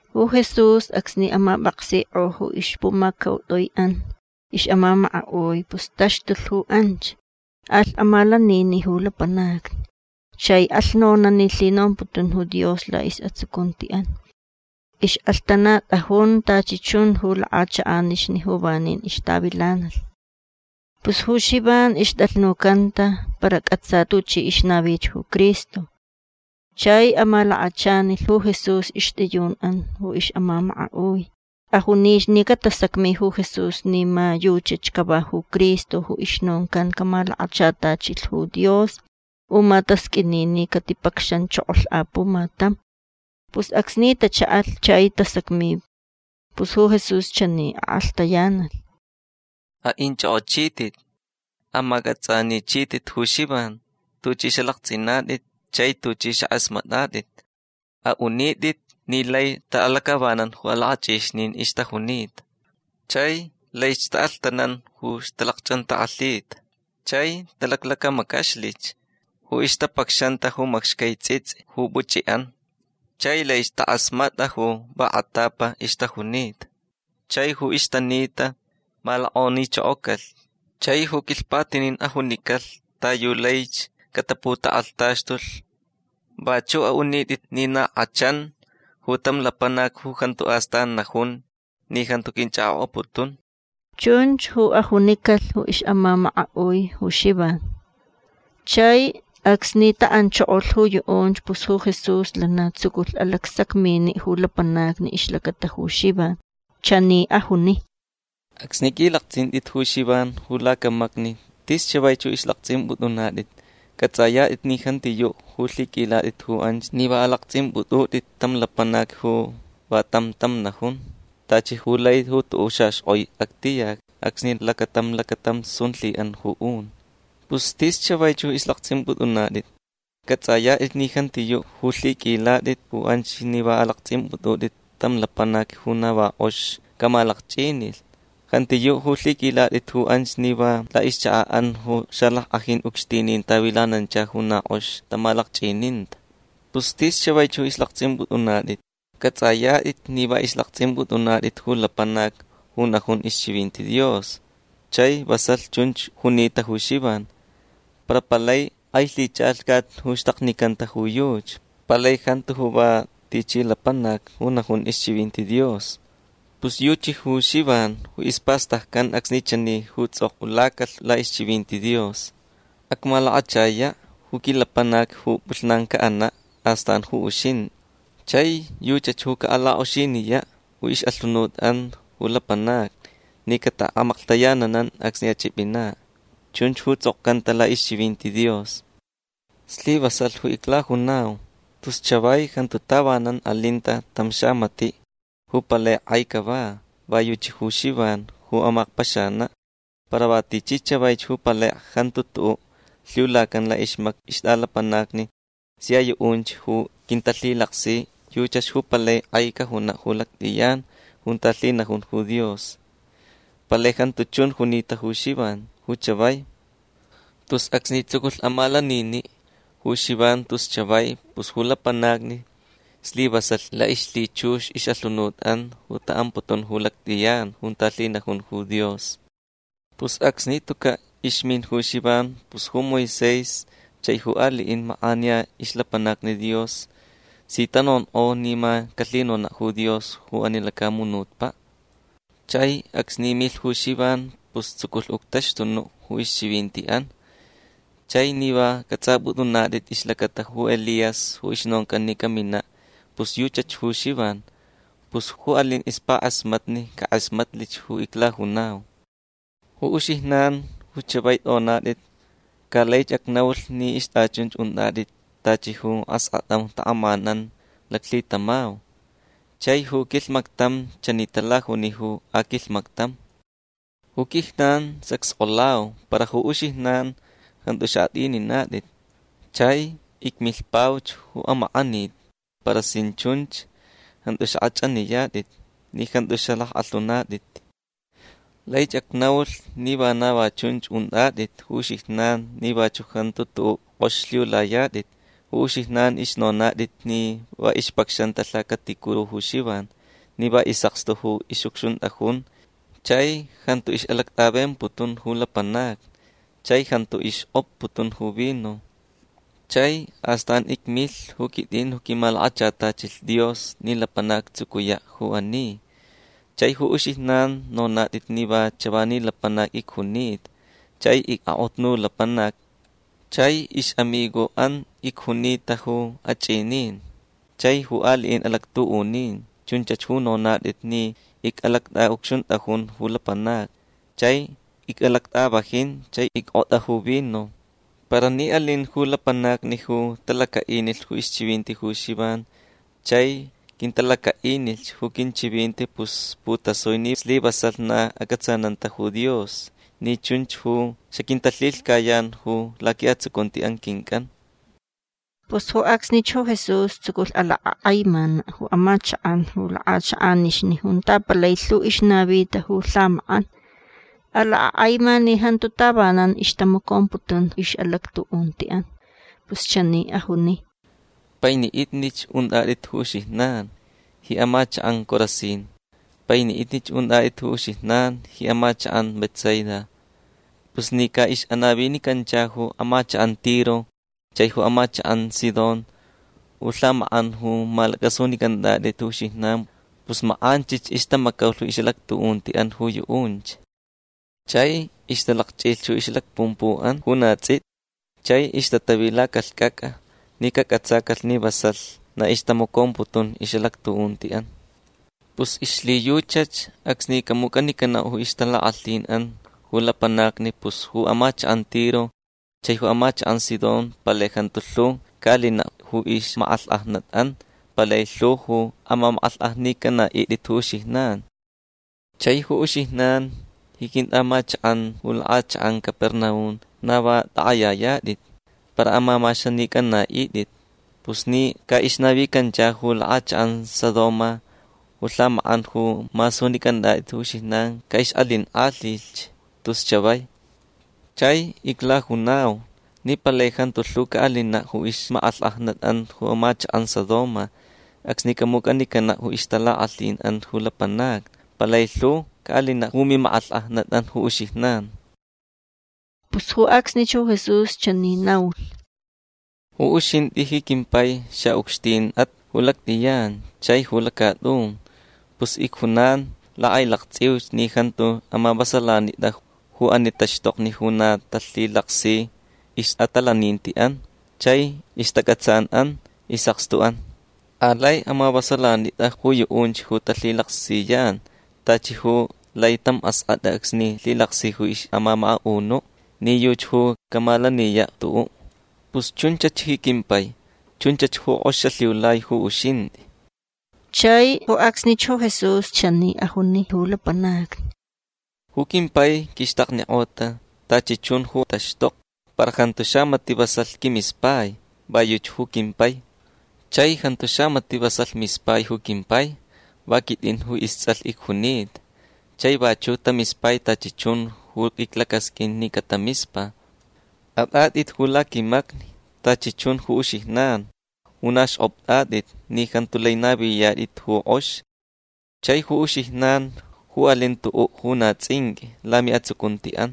Ju Jesús acsni amapʼaksikʼo ju ixpumacautʼuiʼan ixʼamamakaʼui pus taxtulh ju anch. Alh amalaniniʼ ju lapanacni. Chai alh nonaʼ ni lhinomputun ju Dios laʼisʼatsucuntiʼan. Ixʼalhtanatʼajun tachi chun ju lakʼachakʼanixni ju vanin ixtavilanalh. Pus ju Xivan ixtʼalhnucanta para cʼatsa tuchi ixnavich ju Cristo. Chai amalakachanilh ju Jesús ixtʼiyunʼan ju ixʼamamakaʼui. Ajunich ni catasacmi ju Jesús ni ma yuchach cava ju Cristo ju ixnoncan camalakachatachilh ju Dios u ma tasqʼuini ni catipacxanchokolh apumatam. Pus acsni tachaʼalh chai tasacmi pus ju Jesús chani akʼalhtayanalh: ―Aʼinchʼokʼochitʼit. Amacʼatsʼanichitʼit ju Xivan tuchʼi xalaktsʼinatʼit chai tuchʼi xakʼasmatʼatʼit. Aʼunitʼit ni lai taʼalacʼavanan ju alakʼachʼixnin ixtajunita. Chai laich taʼalhtanan ju ixtalacchʼantakʼalhita. Chai talaclacamacaxlich ju ixtapacxanta ju macxcai tsʼitsʼi ju puchʼiʼan. Chai laich takʼasmatʼa ju va kʼatapa ixtajunita. Chai ju ixtanita malokʼonichokocalh. Chai ju quilhpatinin ajunicalh ta yu laich cataputakʼalhtaxtulh. Vachuʼ aʼunitʼit ni na kʼachan ju tam lapanac ju jantu astan najun ni jantu quinchʼakʼokʼaputun. ―Chunch ju ajunicalh ju ixʼamamakaʼui ju Xivan. Chai acsni taʼanchokolh ju yuʼunch pus ju Jesús lana tsuculh alacsacminiʼ ju lapanacni ixlacata ju Xivan. Chani ajuni: ―Acsni qʼuilaktsʼintʼit ju Xivan ju lacamacni tis chavaich ju ixlaktsʼimpʼutʼunatʼit. Cʼatsʼayatʼit ni jantiyuʼ ju lhiqʼuilatʼit ju anch ni va alaktsʼimpʼutʼutʼit tam lapanac ju va tam tam najun tachi ju lai ju tuʼuʼ xaxkʼoi actiyac acsni lacatam lacatam sun lhiʼan ju un. Pus tis chavaich ju ixlaktsʼimpʼutʼunatʼit. Cʼatsʼayatʼit ni jantiyuʼ ju lhiqʼuilatʼit ju anch ni va alaktsʼimpʼutʼutʼit tam lapanac ju na va kʼox camalakchʼinilh. Jantiyuʼ ju lhiqʼuilatʼit ju anch ni va laʼixchakaʼan ju xalackʼajin ucxtinin tavilanancha ju na kʼox tamalakchʼininta. Pus tis chavaich ju ixlaktsʼimpʼutʼunatʼit. Cʼatsʼayatʼit ni va ixlaktsʼimpʼutʼunatʼit ju lapanac ju najun ixchivinti Dios. Chai vasalh chunch junita ju Xivan. Para palai kʼai lhichʼalhcat ju xtaknicanta ju yuchi. Palai jantu va tichi lapanac ju najun ixchivinti Dios. Pus yuchi ju Xivan ju ispastaccan acsni chani ju tsʼokʼulacalh laʼixchivinti Dios: Acmalakachayaʼ ju quilapanac ju pʼulhnan caʼanaʼ. Astan ju uxintʼi. Chai yuchach ju caʼalakʼoxiniyaʼ ju ixʼalhunutʼan ju lapanacni ni cataʼamaklhtayananan acsni achʼipʼinaʼ. Chunch ju tsʼokcanta laʼixchivinti Dios. Slivasalh ju iclajunau. Tus chavai jantu tavanan alinta tam xamatiʼ ju palai kʼai cava. Va yuchi ju Xivan ju amakpaxanaʼ. Para va tichi chavaich ju palai jantu tuʼuʼ lhiulacan laʼixmacni ixtʼalapanacni sia yuʼunch ju quintalhilaksi yuchach ju palai kʼai cajunaʼ ju lactʼiyan junta lhinajun ju Dios. Palai jantu chun junita ju Xivan ju chavai. Tus acsni tsuculh amalaniniʼ ju Xivan tus chavai pus ju lapanacni slivasalh laʼixlhichux ixʼalhunutʼan taʼamputun ju lactʼiyan junta lhinajun ju Dios. Pus acsni tucaʼ ixmin ju Xivan pus ju Moisés chai ju aliʼin makʼaniya ixlapanacni Dios si tanonkʼo ni ma calhinonaʼ ju Dios ju ani lacamunutpaʼ. Chai acsni milh ju Xivan pus tsuculh uctaxtunuʼ ju ixchivintiʼan. Chai ni va cʼatsʼapʼutʼunatʼit ixlacata ju Elías ju ixnoncan ni caminaʼ pus yuchach ju Xivan. Pus ju alin ixpakʼasmatni cakʼasmatlich ju iclajunau. Ju uxijnan ju chavai tʼonatʼit ca laich acnaulh ni ixtʼachunch untʼatʼit tachi ju askʼatʼan ju takʼamanan laclhitamau. Chai ju quilhmactam chani talajuni ju aquilhmactam: “Ju quijnan xacskʼolau para ju uxijnan jantu xaʼatʼininatʼit. Chai icmilhpauch ju amakʼanit para sin chunch jantu xakʼachʼaniyatʼit ni jantu xalackʼalhunatʼit”. Laich acnaulh ni vana va chunch untʼatʼit ju uxijnan ni vachuʼ jantu tuʼuʼ kʼox lhiulayatʼit. Ju uxijnan ixnonatʼit ni va ixpacxanta lhacaticuru ju Xivan ni va isʼakstu ju ixʼucxuntʼajun chai jantu ixʼalactʼavemputun ju lapanacni chai jantu ixkʼotputun ju vino. Chai astan icmilh ju quitʼin ju quimalakachatachilh Dios ni lapanac actsucuyaʼ ju ani. Chai ju uxijnan nonatʼit ni va chavani lapanac icjunita chai icʼakʼotnu lapanac chai ixʼamigoʼan icjunita ju achʼinin chai ju aliʼin alactuʼunin. Chunch ju nonatʼit ni icʼalactʼaʼucxuntʼajun ju lapanacni chai icʼalactʼavajin chai ickʼotʼa ju vino. Para ni alin ju lapanacni ju talacaʼinilh ixchivinti ju Xivan chai quintalacaʼinilh ju quinchivinti pus putasui ni slivasalh na acʼatsananta ju Dios ni chunch ju xaquintalhilhcayan ju laquiʼatsucunti quincʼan. Pus ju acsnich ju Jesús tsuculh alakʼakʼaimanaʼ ju amachakʼan ju lakʼachakʼanixni junta palai lhu ixnavita ju lhamakʼan. Alakʼakʼaima ni jantu tavanan ixtamacomputun ixʼalactuʼuntiʼan. Pus chani ajuni: ―Painiʼitnich untʼatʼit ju uxijnan ji amachakʼan Corazín. Painiʼitnich untʼatʼit ju uxijnan ji amachakʼan Betsaida. Pus ni caʼixʼanavinicancha ju amachakʼan Tiro chai ju amachakʼan Sidón ju lhamakʼan ju malacʼasunicʼantʼatʼit ju uxijnan pus makʼanchich ixtamacaulh ixʼalactuʼuntiʼan ju yuʼunch. Chai ixtalakchʼilh ixlacpumpuʼan ju na tsʼiti chai ixtatavi lacalhcʼacʼa ni cacʼatsacalh ni vasalh na ixtamacomputun ixʼalactuʼuntiʼan. Pus ixlhiyuchach acsni camucʼanicanaʼ ju ixtalakʼalhinʼan ju lapanacni pus ju amachakʼan Tiro chai ju amachakʼan Sidón palai jantu lhu caʼalinaʼ ju ixmakʼalhkʼajnatʼan. Palai lhu ju amamakʼalhkʼajnicʼanaʼitʼit ju uxijnan. Chai ju uxijnan ji quintʼaʼamachakʼan ju lakʼachakʼan Capernaum na va takʼayayatʼit. Para amamaxanicʼanaʼitʼit. Pus ni caʼixnavicancha ju lakʼachakʼan Sodoma ju lhamakʼan ju masunicʼantʼatʼit ju uxijnan caʼixʼalinkʼalhilhch tus chavai. Chai iclajunau ni palai jantu lhu caʼalinaʼ ju ixmakʼalhkʼajnatʼan ju amachakʼan Sodoma acsni camucʼanicanaʼ ju ixtalakʼalhinʼan ju lapanacni. Palai lhu caʼalinaʼ ju mimakʼalhkʼajnatʼan ju uxijnan. Pus ju acsnich ju Jesús chani naulh: ―Ju uxintʼi ji quimpai xaʼucxtinʼat ju lactʼiyan chai ju lacatʼun. Pus icjunan lakʼailaktsʼiuch ni jantu amavasalanitʼa ju ani taxtokni ju na talhilaksi ixʼatalanintiʼan chai ixtacʼatsanʼan isʼakstuʼan. Alai amavasalanitʼa ju yuʼunch ju talhilaksiyan tachi ju lai tam askʼatʼa acsni lhilaksi ixʼamamakaʼunuʼ ni yuchi ju camalaniyaʼ tuʼuʼ. Pus chunchach ji quimpai. Chunchach ju kʼox xalhiulai ju uxintʼi. Chai ju acsnich ju Jesús chani ajuni ju lapanacni: ―Ju quimpai quixtaknikʼota tachi chun ju taxtokni. Para jantu xamatiʼ vasalh quimispai. Va yuchi ju quimpai. Chai jantu xamatiʼ vasalh mispai ju quimpai. Va quitʼin ju istsʼalh icjunita. Chai vachuʼ tamispai tachi chun ju iclacasqʼuin ni catamispa. Atʼatʼit ju laquimacni tachi chun ju uxijnan ju na xkʼoptʼatʼit ni jantu lai naviyatʼit ju kʼox chai ju uxijnan ju alin tuʼuʼ ju na tsʼinqʼui lamiʼatsucuntiʼan.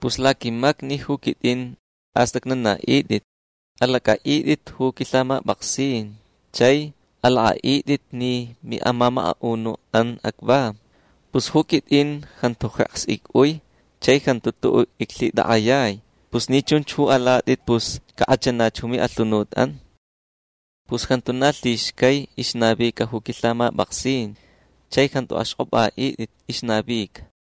Pus laquimacni ju quitʼin astʼacnanaʼitʼit. Alacʼaʼitʼit ju quilhamapʼaksin chai alakʼaʼitʼit ni miʼamamakaʼunuʼan acva. Pus ju quitʼin jantu jeks icʼui chai jantu tuʼuʼ iclhitakʼayai. Pus ni chunch ju alatʼit pus cakʼachanach ju miʼalhunutʼan. Pus jantu na lhixcai ixnavica ju quilhamapʼaksin. Chai jantu axkʼopʼaʼitʼit ixnavica.